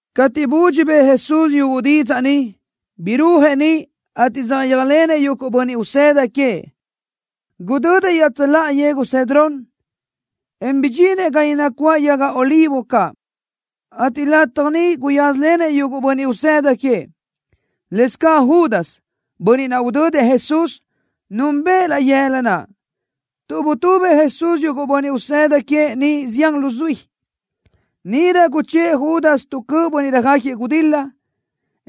Cateʼ budxi bëʼë Jesús yuguʼ didzaʼ ni, birúajëʼ niʼ, ateʼ saʼyéajlenëʼ yuguʼ bönniʼ usëda queëʼ. Gudödëʼ iaʼtsöláʼa yegu Cedrón, en bidxinëʼ ga niʼ nacuáʼ yaga olivo caʼ, ateʼ lataj ni guyázalenëʼ yuguʼ bönniʼ usëda queëʼ. Lëscaʼ Judas, bönniʼ naʼ udödëʼ Jesús, núnbëʼë laʼ yëla naʼ, tuʼ butubëʼ Jesús yuguʼ bönniʼ usëda queëʼ niʼ zián luzuí. Níʼirö guchë́ʼë Judas tu cöʼ bönniʼ röjáquiëʼ gudil-la,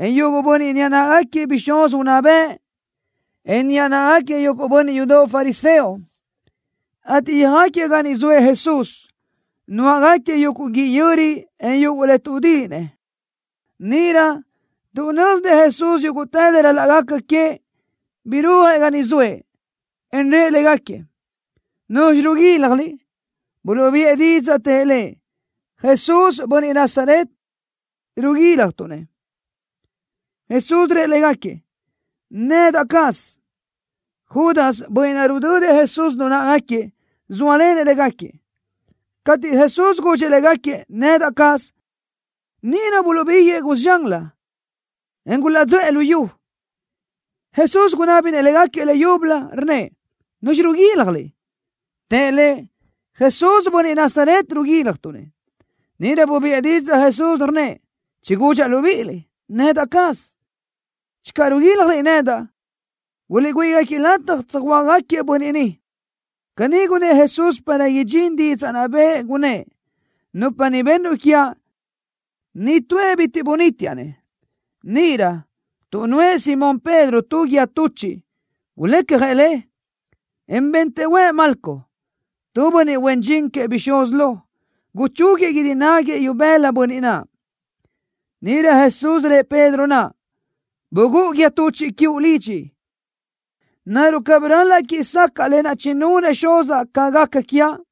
en yuguʼ bönniʼ niʼa náʼagaquiëʼ bixúz unná bëʼ, en niʼa náʼagaquiëʼ yuguʼ bönniʼ yudoʼ fariseo, ateʼ yöjáquiëʼ ga niʼ zoëʼ Jesús, nuáʼagaquiëʼ yuguʼ guíʼ yöri, en yuguʼ le tuʼdíʼinëʼ. Níʼirö, tuʼ nö́zinëʼ Jesús yúguʼtë le ral-laʼ gaca queëʼ, birúajëʼ ga niʼ zoëʼ, en rëʼ légaquiëʼ: —¿Nuzxi riguíljaliʼ? Buluʼbiʼë didzaʼ, tëʼ Lëʼ: —Jesús, bönniʼ Nazaret, riguíljatuʼ-nëʼ. Jesús rëʼ légaquiëʼ: —Nedaʼ caz. Judas, bönniʼ naʼ rudödëʼ Jesús lu náʼagaquiëʼ, zóalenëʼ légaquiëʼ. Cateʼ Jesús gudxëʼ légaquiëʼ: “Nedaʼ caz”, níʼirö buluʼbíguëʼë cusi zxanlö, en gulaʼdzöʼë lu yu. Jesús gunábinëʼ légaquiëʼ leyúbölö, rnnëʼ: —¿Nuzxi riguíljaliʼ? Tëʼ Lëʼ: —Jesús, bönniʼ Nazaret, riguíljatuʼ-nëʼ. Níʼirö bubiʼë didzaʼ Jesús, rnnëʼ: —Chigúdxaʼ libíʼiliʼ: Nedaʼ caz. Channö riguíljaliʼ nedaʼ, guliʼgüíʼ-gáquiëʼ lataj tsöjhuö́jgaquiëʼ bönniʼ ni. Caní gunnë́ʼ Jesús para idxín didzaʼ naʼ bëʼë, gunnë́ʼ: “Nupa ni bennuʼ quiaʼ, nitúëʼ bitiʼ bunítiaʼ-nëʼ.” Níʼirö, tuʼ nuʼë Simón Pedro tu guíë tuchiʼ, gulecjëʼ le, en bentëʼ huëʼ Malco, tu bönniʼ huen dxin queëʼ bixúz lo, guchúguiëʼ guídi náguiëʼ ibëla bönniʼ naʼ. Níʼirö Jesús rëʼ Pedro naʼ: —Bugúʼu guíë tuchiʼ quiuʼ lidxi. ¿Naruʼ cabí ral-laʼ quíʼi sacaʼa lë naʼ chinunëʼ Xuzaʼ ca gaca quiaʼ?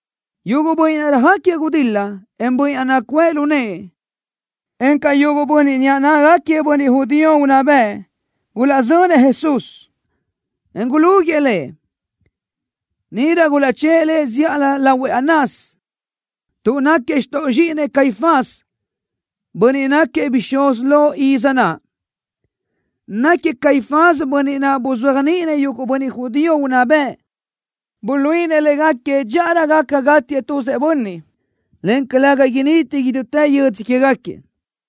Yuguʼ bönniʼ naʼ röjáquiëʼ gudil-la, en bönniʼ naʼ nacuʼë lu nëʼë, encaʼ yuguʼ bönniʼ niʼa náʼagaquiëʼ bönniʼ judío unná bëʼ gulaʼzönëʼ Jesús, en gulúguiʼë Lëʼ. Níʼirö gulaʼchë́ʼë Lëʼ zíʼalö lahuëʼ Anás, tuʼ náquiëʼ xtoʼ zxíʼinëʼ Caifás, bönniʼ náquiëʼ bixúz lo iz naʼ. Náquiëʼ Caifás bönniʼ naʼ buzéajniʼinëʼ yuguʼ bönniʼ judío unná bëʼ, buluíʼinëʼ légaquiëʼ dxíʼarö gaca gátiëʼ tuzëʼ bönniʼ, en calëga initi idútë yödzö quégaquiëʼ.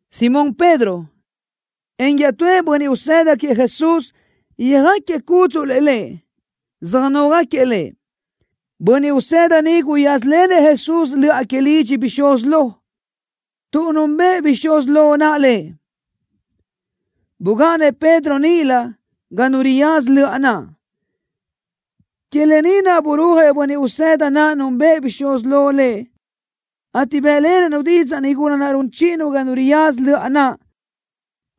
Simón Pedro, en iaʼtúëʼ bönniʼ usëda queëʼ Jesús yöjáquiëʼ cúdzuʼlëʼ Lëʼ, söjnógaquiëʼ Lëʼ. Bönniʼ usëda ni guyázalenëʼ Jesús löʼa que lidxi bixúz lo, tuʼ núnbëʼë bixúz lo naʼ lëʼ. Bugáʼanëʼ Pedro níʼilö ga nu riyaza löʼa naʼ. Que lë ni naʼ burúajëʼ bönniʼ usëda naʼ núnbëʼë bixúz lo lëʼ, ateʼ bë́ʼlenëʼ-nu didzaʼ nigula naʼ run chíʼinu ga nu riyaza löʼa naʼ,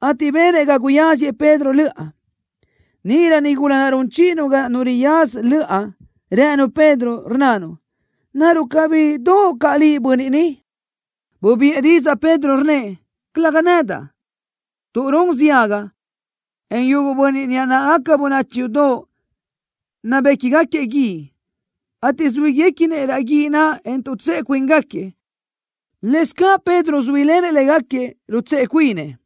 ateʼ benëʼ ga guyáziëʼ Pedro löʼa. Níʼirö nigula naʼ run chíʼinu ga nu riyaza löʼa rënu Pedro, rnnanu: —¿Naruʼ cabí doʼo caʼ liʼ bönniʼ ni? Bubiʼë didzaʼ Pedro, rnnëʼ: —Calëga nedaʼ. Tuʼ run ziaga, yuguʼ bönniʼ huen dxin, en yuguʼ bönniʼ niʼa náʼagaca bönachi yudoʼ nabéquigaquiëʼ guíʼ, ateʼ zuíguequinëʼ raʼ guíʼ naʼ, en tuʼtsëʼe cuíngaquiëʼ. Lëscaʼ Pedro zuílenëʼ légaquiëʼ, rutsëʼe cuinëʼ.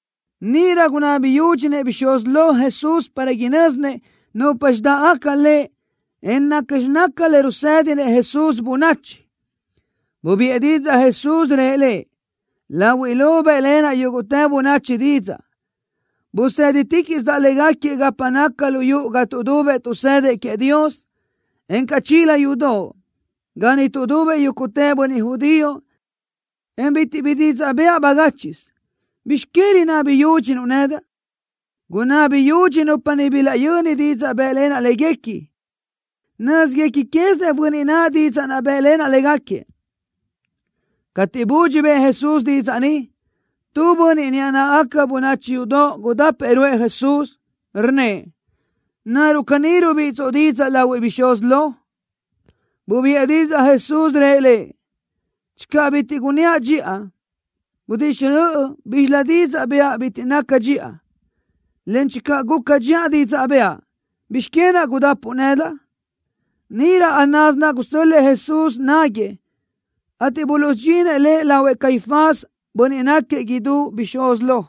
Níʼirö gunabi yúdxinëʼ bixúz lo Jesús para inö́zinëʼ nupxi dáʼgaca Lëʼ, en nacxi naca le rusedinëʼ Jesús bönachi. Bubiʼë didzaʼ Jesús, rëʼ lëʼ: —Lahuiʼ lo bë́ʼlenaʼ yúguʼtë bönachi didzaʼ. Buseditiquiʼsidaʼ légaquiëʼ gapa naca lu yuʼu ga tuʼdubëʼ tuʼsëdëʼ queëʼ Dios, encaʼ chila yudoʼ, ga niʼ tuʼdubëʼ yúguʼtë bönniʼ judío, en bitiʼ bi didzaʼ bëʼa bagáchiʼsö. ¿Bizx que rinabi yúdxinuʼ nedaʼ? Gunabi yudxi nupa niʼ bilaʼyöni didzaʼ bë́ʼlenaʼ léguequi. Nö́zguequi quézinëʼ bönniʼ naʼ didzaʼ naʼ bë́ʼlenaʼ légaquiëʼ. Cateʼ budxi bëʼë Jesús didzaʼ ni, tu bönniʼ niʼa náʼagaca bönachi yudoʼ gudápëʼë ruʼë Jesús, rnnëʼ: —¿Naruʼ caní rubíʼitsoʼ didzaʼ lahuëʼ bixúz lo? Bubiʼë didzaʼ Jesús, rëʼ lëʼ: —Channö bitiʼ gunníaʼ dxiʼa, gudixjöʼ bízxilö didzaʼ bëʼa bitiʼ naca dxiʼa, en channö guca dxiʼa didzaʼ bëʼa, ¿bizx que naʼ gudápuʼu nedaʼ? Níʼirö Anás naʼ gusö́l-lëʼë Jesús náguëʼë, ateʼ buluʼsudxinëʼ Lëʼ lahuëʼ Caifás, bönniʼ náquiëʼ idú bixúz lo.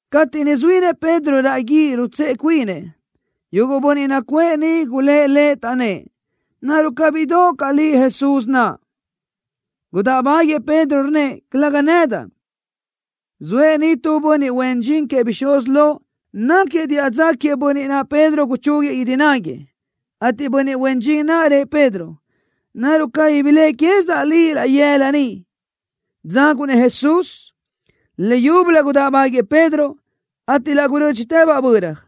Cateʼ niʼ zuínëʼ Pedro raʼ guíʼ rutsëʼe cuinëʼ, yuguʼ bönniʼ nacuʼë niʼ gulë́ʼ lëʼ, taʼnnë́ʼ: —¿Naruʼ cabí doʼo caʼ liʼ Jesús naʼ? Gudáʼbaguiëʼ Pedro, rnnëʼ: —Calëga nedaʼ. Zoëʼ niʼ tu bönniʼ huen dxin queëʼ bixúz lo, náquiëʼ diʼa dza queëʼ bönniʼ naʼ Pedro guchúguiëʼ guídi náguiëʼ, ateʼ bönniʼ huen dxin naʼ rëʼ Pedro: —¿Naruʼ cabí biléʼe quézidaʼ liʼ laʼ yëla niʼ, dzaguʼ-nëʼ Jesús? Leyúbölö gudáʼbaguiëʼ Pedro, ateʼ laʼ gurö́dxitëbaʼ böra.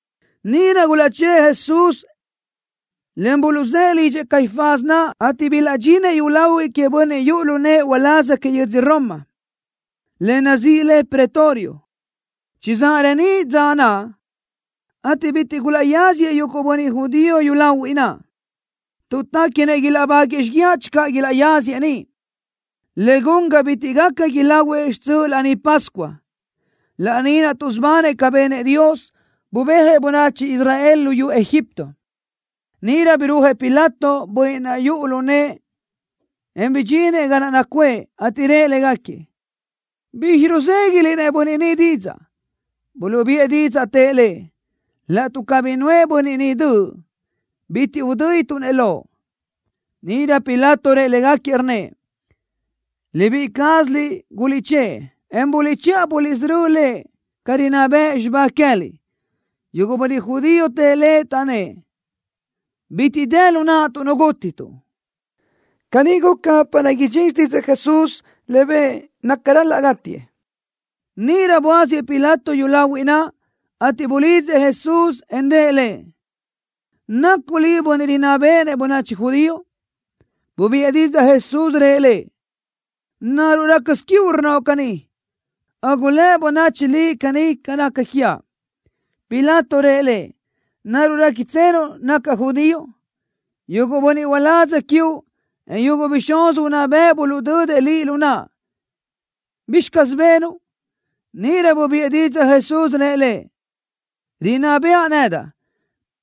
Níʼirö gulaʼchë́ʼë Jesús, en buluʼzë́ʼë lidxëʼ Caifás naʼ, ateʼ bilaʼdxinëʼ yúlahuiʼ queëʼ bönniʼ yuʼu lu nëʼë uláz que yödz Roma, le nazíʼi le Pretorio. Chizáʼ reníʼ dza naʼ, ateʼ bitiʼ gulaʼyáziëʼ yuguʼ bönniʼ judío yúlahuiʼ naʼ, tuʼ téquinëʼ ilaʼbáguëʼë xíguiaʼ channö ilaʼyáziëʼ niʼ, le gun ga bitiʼ gaca ilahuëʼ xtsöʼ Laní Pascua, laní naʼ tuʼsubanëʼ ca benëʼ Dios, bubéajëʼ bönachi Israel luyú Egipto. Níʼirö birúajëʼ Pilato, bönniʼ naʼ yuʼu lu nëʼë, en bidxinëʼ ga naʼ nacuʼë, ateʼ rëʼ légaquiëʼ: —¿Bizxi ruzéguiʼliʼ-nëʼ bönniʼ ni didzaʼ? Buluʼbiʼë didzaʼ, tëʼ lëʼ: —Laʼtuʼ cabí nuʼë bönniʼ ni döʼ, bitiʼ udö́dituʼ-nëʼ loʼ. Níʼirö Pilato rëʼ légaquiëʼ, rnnëʼ: —Libíʼi cázaliʼ guliʼchë́ʼë, en buliʼchiʼa buliʼsörö́ Lëʼ ca rinná bëʼ xibá queë́liʼ. Yuguʼ bönniʼ judío tëʼ lëʼ, taʼnnë́ʼ: —Bitiʼ dë lu naʼtuʼ nu gútituʼ. Caní guca para idxín xtídzëʼë Jesús, le bëʼë naca ral-laʼ gátiëʼ. Níʼirö buáziëʼ Pilato yúlahuiʼ naʼ, ateʼ bulidzëʼ Jesús, en rëʼ Lëʼ: —¿Nacuʼ Liʼ Bönniʼ Rinná Béʼenëʼ Bönachi Judío? Bubiʼë didzaʼ Jesús, rëʼ lëʼ: —¿Naruʼ rácasö quiuʼ rnnoʼ caní, o gulë́ bönachi liʼ caní ca naca quiaʼ? Pilato rëʼ Lëʼ: —¿Naruʼ réquitsenuʼ nacaʼ judío? Yuguʼ bönniʼ uládz quiuʼ, en yuguʼ bixúz unná bëʼ buluʼdödëʼ Liʼ lu naʼa. ¿Bizxi caz benuʼ? Níʼirö bubiʼë didzaʼ Jesús, rëʼ lëʼ: —Rinná bëʼa nedaʼ,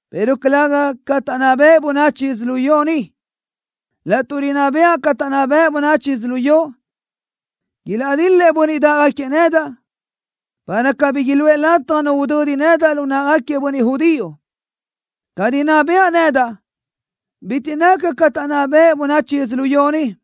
pero calëga ca taʼnná bëʼ bönachi yödzölió ni. Laʼtuʼ rinná bëʼa ca taʼnná bëʼ bönachi yödzölió, ilaʼdil-lëʼ bönniʼ dáʼgaquiëʼ nedaʼ, para cabí iluʼë lataj nu udödi nedaʼ lu náʼagaquiëʼ bönniʼ judío. Ca rinná bëʼa nedaʼ bitiʼ naca ca taʼnná bëʼ bönachi yödzölió ni.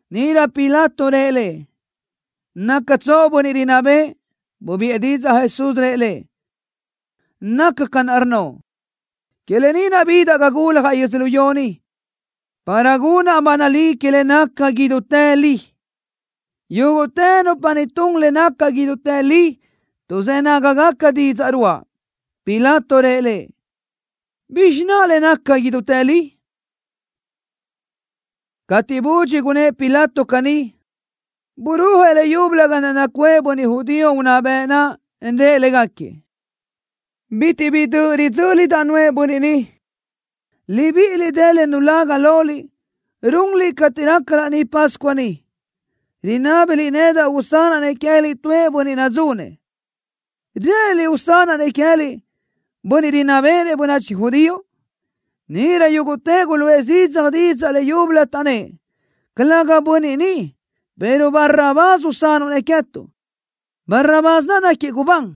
Níʼirö Pilato rëʼ Lëʼ: —¿Nácatsoʼ bönniʼ rinná bëʼë? Bubiʼë didzaʼ Jesús, rëʼ lëʼ: —Nacaʼ ca naʼ rnnoʼ. Que lë ni naʼ bidaʼ ga guljaʼ yödzölió ni, para gunaʼ ba nalí que le naca idútë li. Yúguʼtë nupa ni tun le naca idútë li tuʼzë́ nágagaca didzaʼ ruáʼa. Pilato rëʼ Lëʼ: —¿Bizxi naʼ le naca idútë li? Cateʼ budxi gunnë́ʼ Pilato caní, burúajëʼ leyúbölö ga naʼ nacuʼë bönniʼ judío unná bëʼ naʼ, en rëʼ légaquiëʼ: —Bitiʼ bi döʼ ridzö́lidaʼ nuʼë bönniʼ ni. Libíʼiliʼ dë tu le nulaga loliʼ runliʼ cateʼ raca Laní Pascua ni, rinábiliʼ nedaʼ usanaʼ-nëʼ queë́liʼ tuëʼ bönniʼ nadzunëʼ. ¿Rë́ʼëniliʼ usanaʼ-nëʼ queë́liʼ Bönniʼ Rinná Béʼenëʼ Bönachi Judío? Níʼirö yúguʼtëʼ guluʼë zidzaj didzaʼ leyúbölö, taʼnnë́ʼ: —¡Calëga bönniʼ ni, pero Barrabás usanuʼ-nëʼ queë́tuʼ! Barrabás naʼ náquiëʼ gubán.